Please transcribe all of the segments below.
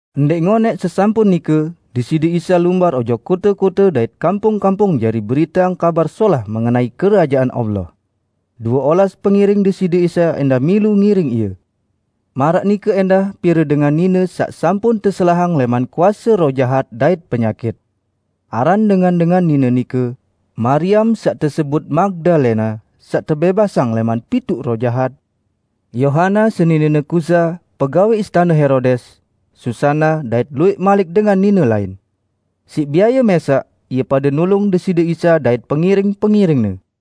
Ndẽq ngonẽq sesampun nike, Deside Isa lumbar ojok kote-kote dait kampung-kampung jari beriteang Kabar Solah mengenai Kerajaan Allah. Due olas pengiring Deside Isa ẽndah milu ngiring Ie. Maraq nike ẽndah pire dengan nine saq sampun teselahang lẽman kuase roh jahat dait penyakit. Aran dengan-dengan nine nike, Mariam saq tesebut Magdalena (saq tebẽbasang lẽman pituq roh jahat); Yohana, seninene Kuza, pegawẽ istane Herodes; Susana, dait luwẽq malik dengan nine lain. Siq biaye mẽsaq, ie pade nulung Deside Isa dait pengiring-pengiring-Ne.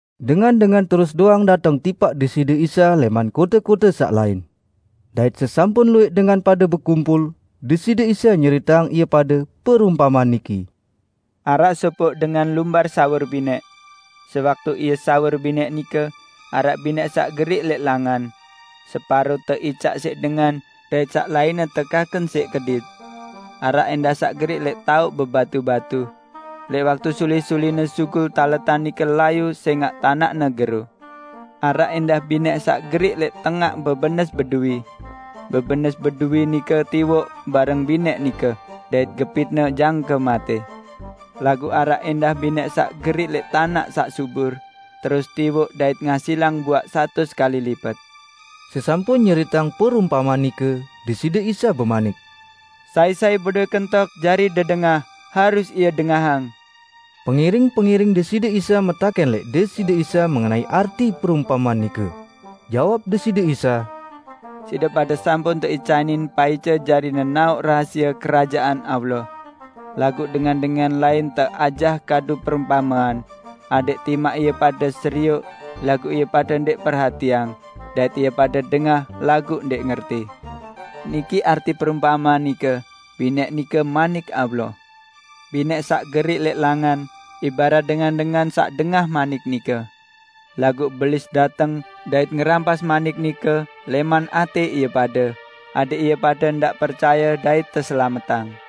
Dengan-dengan terus doang dateng tipaq Deside Isa lẽman kote-kote saq lain. Dait sesampun luwẽq dengan pade bekumpul, Deside Isa nyeriteang ie pade perumpamean niki: "Araq sopoq dengan lumbar sawur binẽq. Sewaktu ie sawur binẽq nike, araq binẽq saq geriq lẽq langan. Separo teicaq siq dengan dait saq lainne tekaken siq kedit. Araq ẽndah saq geriq lẽq taoq bebatu-batu. Lẽq waktu suli-suline sugul taletan nike layu sẽngaq tanaqne gero. Araq ẽndah binẽq saq geriq lẽq tengaq bebenes beduwi. Bebenes beduwi nike tiwoq bareng binẽq nike, dait gepitne jangke matẽ. Laguq araq ẽndah binẽq saq geriq lẽq tanaq saq subur, terus tiwoq dait ngasilang buaq satus kali lipet." Sesampun nyeriteang perumpamean nike, Deside Isa bemanik, "Sai-sai bedowẽ kentok jari dedengah, harus ie dengahang!" Pengiring-pengiring Deside Isa metakẽn lẽq Deside Isa mengenai arti perumpamean nike. Jawab Deside Isa, "Side pade sampun teicanin paice jari nenaoq rahasie Kerajaan Allah. Laguq dengan-dengan lain teajah kadu perumpamean, adẽq timaq ie pade serioq, laguq ie pade ndẽq perhatiang; dait ie pade dengah laguq ndẽq ngerti." "Niki arti perumpamean nike: Binẽq nike Manik Allah. Binẽq saq geriq lẽq langan, ibarat dengan-dengan saq dengah manik nike. Laguq Belis dateng dait ngerampas manik nike lẽman atẽ ie pade, adẽq ie pade ndaq percaye dait teselametang.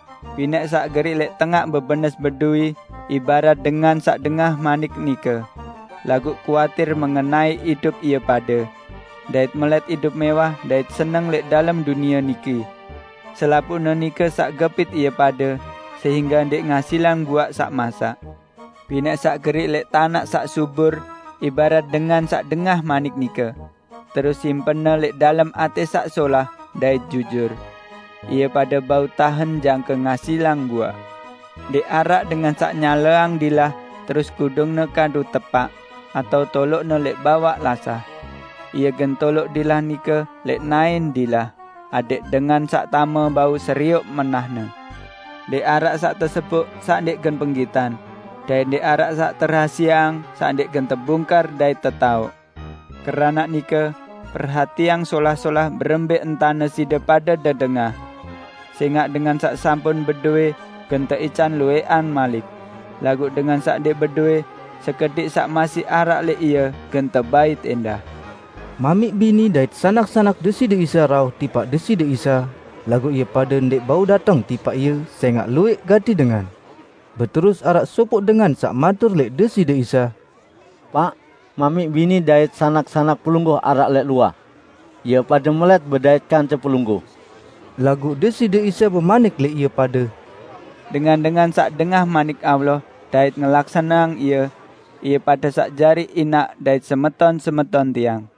Binẽq saq geriq lẽq tengaq bebenes beduwi ibarat dengan saq dengah manik nike, laguq kuatir mengenai idup ie pade; dait melẽt idup mẽwah dait seneng lẽq dalem dunie niki. Selapuqne nike saq gepit ie pade sehingge ndẽq ngasilang buaq saq masak. Binẽq saq geriq lẽq tanaq saq subur ibarat dengan saq dengah manik nike, terus simpenne lẽq dalem atẽ saq solah dait jujur. Ie pade bau tahen jangke ngasilang buaq." "Ndẽq araq dengan saq nyaleang dilah terus kudungne kadu tepaq, atao toloqne lẽq bawaq lasah. Ie gen toloq dilah nike lẽq naẽn dilah, adẽq dengan saq tame bau serioq menahne. Ndẽq araq saq teseboq saq ndẽq gen penggitan; dait ndẽq araq saq terahasieang saq ndẽq gen tebungkar dait tetaoq. Keranaq nike, perhatiang solah-solah berembẽ entane side pade dedengah. Sẽngaq dengan saq sampun bedowẽ, gen teican luwẽqan malik; laguq dengan saq ndẽq bedowẽ, sekediq saq masih araq lẽq ie gen tebait ẽndah." Mamiq bini dait sanak-sanak Deside Isa rauh tipaq Deside Isa, laguq ie pade ndẽq bau dateng tipaq Ie sẽngaq luwẽq gati dengan. Beterus araq sopoq dengan saq matur lẽq Deside Isa, "Paq, mamiq bini dait sanak-sanak Pelungguh araq lẽq luah. Ie pade melẽt bedait kance Pelungguh." Laguq Deside Isa bemanik lẽq ie pade, "Dengan-dengan saq dengah manik Allah dait ngelaksaneang ie, ie pade saq jari inaq dait semeton-semeton Tiang."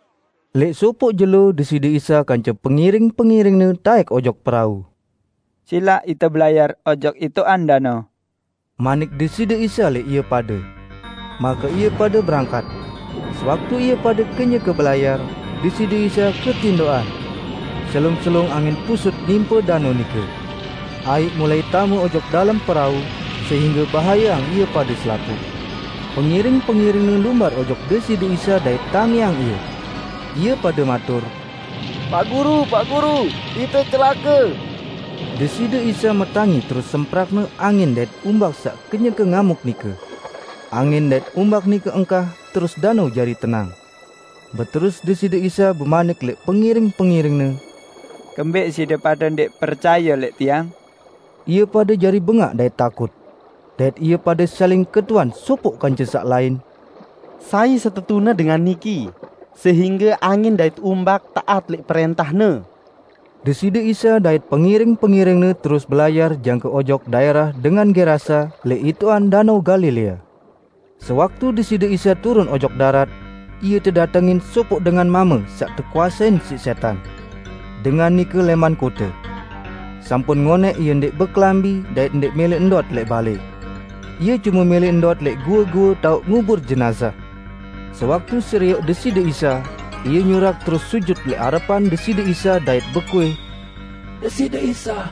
Lẽq sopoq jelo Deside Isa kance pengiring-pengiring-Ne taẽk ojok perau. "Silaq ite belayar ojok itoqan danao," manik Deside Isa lẽq ie pade. Make ie pade berangkat. Sewaktu ie pade kenyeke belayar, Deside Isa ketindoqan. Selung-selung angin pusut nimpe danao nike. Aiq mulai tame ojok dalem perau, sehingge bahayeang ie pade selapuq. Pengiring-pengiring-Ne lumbar ojok Deside Isa dait tangiang Ie. Ie pade matur, "Paq Guru, Paq Guru, ite celake!" Deside Isa metangi terus semprak-Ne angin dait umbak saq kenyeke ngamuk nike. Angin dait umbak nike engkah terus danao jari tenang. Beterus Deside Isa bemanik lẽq pengiring-pengiring-Ne, "Kembẽq side pade ndẽq percaye lẽq Tiang?" Ie pade jari bengaq dait takut. Dait ie pade saling ketuan sopoq kance saq lain, "Sai setetune dengan niki, sehingge angin dait umbak taat lẽq prẽntah-Ne!" Deside Isa dait pengiring-pengiring-Ne terus belayar jangke ojok daẽrah dengan Gerasa lẽq itoqan Danao Galilea. Sewaktu Deside Isa turun ojok darat, Ie tedatengin sopoq dengan mame saq tekuasein siq sẽtan. Dengan nike lẽman kote. Sampun ngonẽq ie ndẽq bekelambi dait ndẽq mẽlẽ ndot lẽq balẽ. Ie cume mẽlẽ ndot lẽq goe-goe taoq ngubur jenazah. Sewaktu serioq Deside Isa, ie nyurak terus sujut lẽq arepan Deside Isa dait bekuih, "Deside Isa,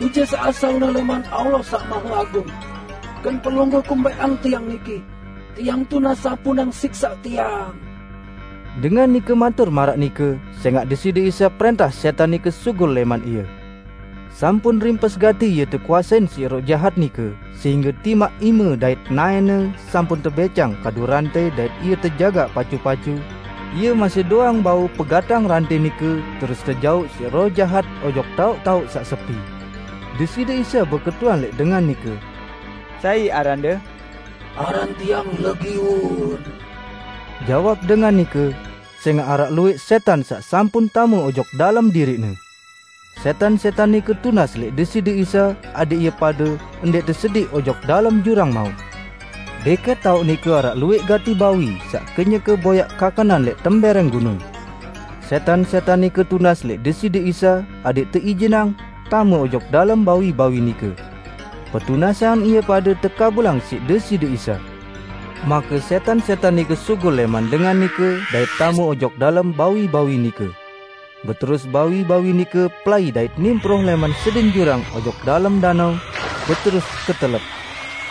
Bije saq asalne lẽman Allah Saq Maheagung! Gen Pelungguh kumbẽqang tiang niki? Tiang tunas sampunang siksaq tiang!" Dengan nike matur maraq nike sẽngaq Deside Isa prẽntah sẽtan nike sugul lẽman ie. Sampun rimpes gati ie tekuasein siq roh jahat nike sehingge timaq ime dait naẽne sampun tebẽcang kadu rantẽ dait ie tejagaq pacu-pacu, ie masih doang bau pegatang rantẽ nike terus tejauq siq roh jahat ojok taoq-taoq saq sepi. Deside Isa beketuan lẽq dengan nike, "Sai arande?" "Aran tiang 'Legiun'," jawab dengan nike -- sẽngaq araq luwẽq sẽtan saq sampun tame ojok dalem diriqne. Sẽtan-sẽtan nike tunas lẽq Deside Isa adẽq ie pade ndẽq tesediq ojok dalem jurang maut. Dẽkẽt taoq nike araq luwẽq gati bawi saq kenyeke boyaq kakenan lẽq tembẽrẽng gunung. Sẽtan-sẽtan nike tunas lẽq Deside Isa adẽq teijinang tame ojok dalem bawi-bawi nike. Petunasan ie pade tekabulang siq Deside Isa. Make sẽtan-sẽtan nike sugul lẽman dengan nike dait tame ojok dalem bawi-bawi nike. Beterus bawi-bawi nike pelai dait nimproh lẽman sedin jurang ojok dalem danao, beterus ketelep.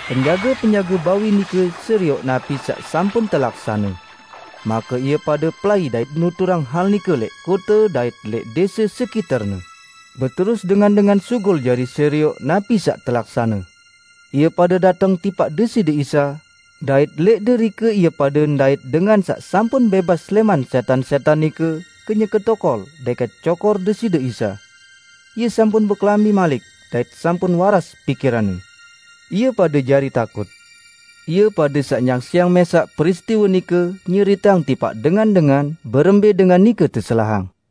Penjage-penjage bawi nike serioq napi saq sampun telaksane. Make ie pade pelai nuturang hal nike lẽq kote dait lẽq dẽse sekiterne. Beterus dengan-dengan sugul jari serioq napi saq telaksane. Ie pade dateng tipaq Deside Isa, dait lẽq derike ie pade ndait dengan saq sampun bẽbas lẽman sẽtan-sẽtan nike kenyeke tokol dẽkẽt cokor Deside Isa. Ie sampun bekelambi malik dait sampun waras pikiranne. Ie pade jari takut. Ie pade saq nyaksiang mẽsaq peristiwe nike nyeriteang tipaq dengan-dengan berembẽ dengan nike teselahang.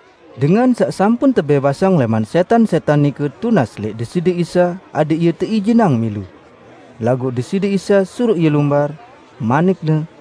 Dengan saq sampun tebẽbasang lẽman sẽtan-sẽtan nike tunas lẽq Deside Isa adẽq ie teijinang milu. Laguq Deside Isa suruq ie lumbar, manik-Ne,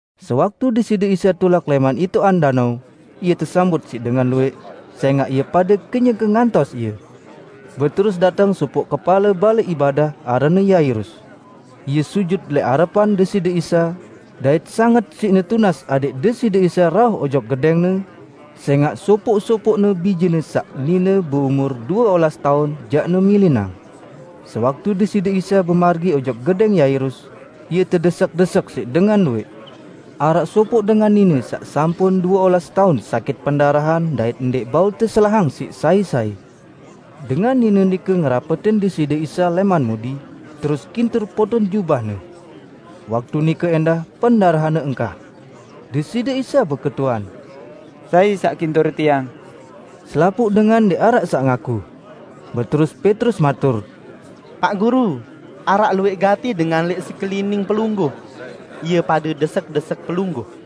Sewaktu Deside Isa tulak lẽman itoqan danao, Ie tesambut siq dengan luwẽq, sẽngaq ie pade kenyeke ngantos Ie. Beterus dateng sopoq kepale balẽ ibadah aranne Yairus. Ie sujut lẽq arepan Deside Isa, dait sanget siqne tunas adẽq Deside Isa rauh ojok gedẽngne, sẽngaq sopoq-sopoqne bijene saq nine beumur due olas taun jaqne milinang. Sewaktu Deside Isa bemargi ojok gedẽng Yairus, Ie tedesek-desek siq dengan luwẽq. Araq sopoq dengan nine saq sampun due olas taun sakit pendarahan dait ndẽq bau teselahang siq sai-sai. Dengan nine nike ngerapetin Deside Isa lẽman mudi, terus kintur poton jubah-Ne. Waktu nike ẽndah pendarahanne engkah. Deside Isa beketuan, "Sai saq kintur Tiang?" Selapuq dengan ndẽq araq saq ngaku. Beterus Petrus matur, "Paq Guru, araq luwẽq gati dengan lẽq sekelining Pelungguh; ie pade desek-desek Pelungguh!"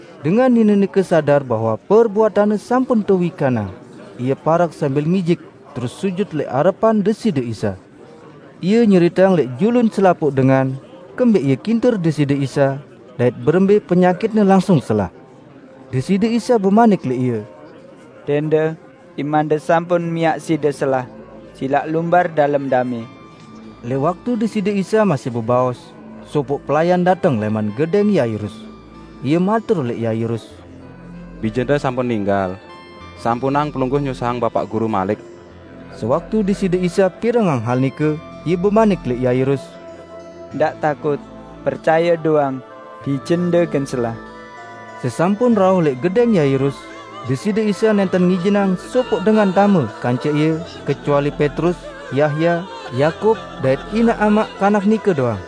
Dengan nine nike sadar bahwe perbuatanne sampun tewikanang, ie parek sambil ngijik terus sujut lẽq arepan Deside Isa. Ie nyeriteang lẽq julun selapuq dengan, kembẽq ie kintur Deside Isa, dait berembe penyakitne langsung selah. Deside Isa bemanik lẽq ie, "Dẽnde, imande sampun miaq side selah, silaq lumbar dalem damẽ." Lẽq waktu Deside Isa masih bebaos, sopoq pelayan dateng lẽman gedẽng Yairus. Ie matur lẽq Yairus, "Bijende sampun ninggal. Sampunang pelungguh nyusahang Bapaq Guru malik." Sewaktu Deside Isa pirengang hal nike, Ie bemanik lẽq Yairus, "Ndaq takut. Percaye doang, bijende gen selah." Sesampun rauh lẽq gedẽng Yairus, Deside Isa nẽnten ngijinang sopoq dengan tame kance Ie kecuali Petrus, Yahya, Yakub dait inaq amaq kanak nike doang.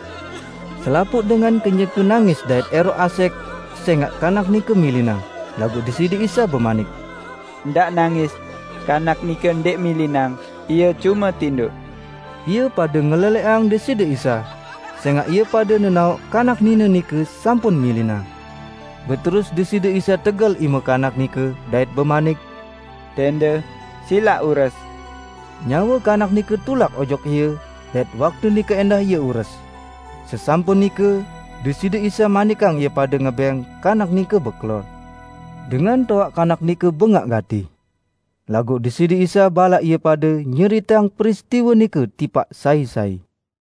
Selapuq dengan kenyeke nangis dait ẽroq asẽq sẽngaq kanak nike milinang. Laguq Deside Isa bemanik, "Ndaq nangis. Kanak nike ndẽq milinang, ie cume tindoq!" Ie pade ngelelẽqang Deside Isa, sẽngaq ie pade nenaoq kanak nine nike sampun milinang. Beterus Deside Isa tegel ime kanak nike dait bemanik, "Dẽnde, silaq ures!" Nyawe kanak nike tulak ojok ie, dait waktu nike ẽndah ie ures. Sesampun nike, Deside Isa manikang ie pade ngebẽng kanak nike bekelor. Dengan toaq kanak nike bengaq gati. Laguq Deside Isa balaq ie pade nyeriteang peristiwe nike tipaq sai-sai.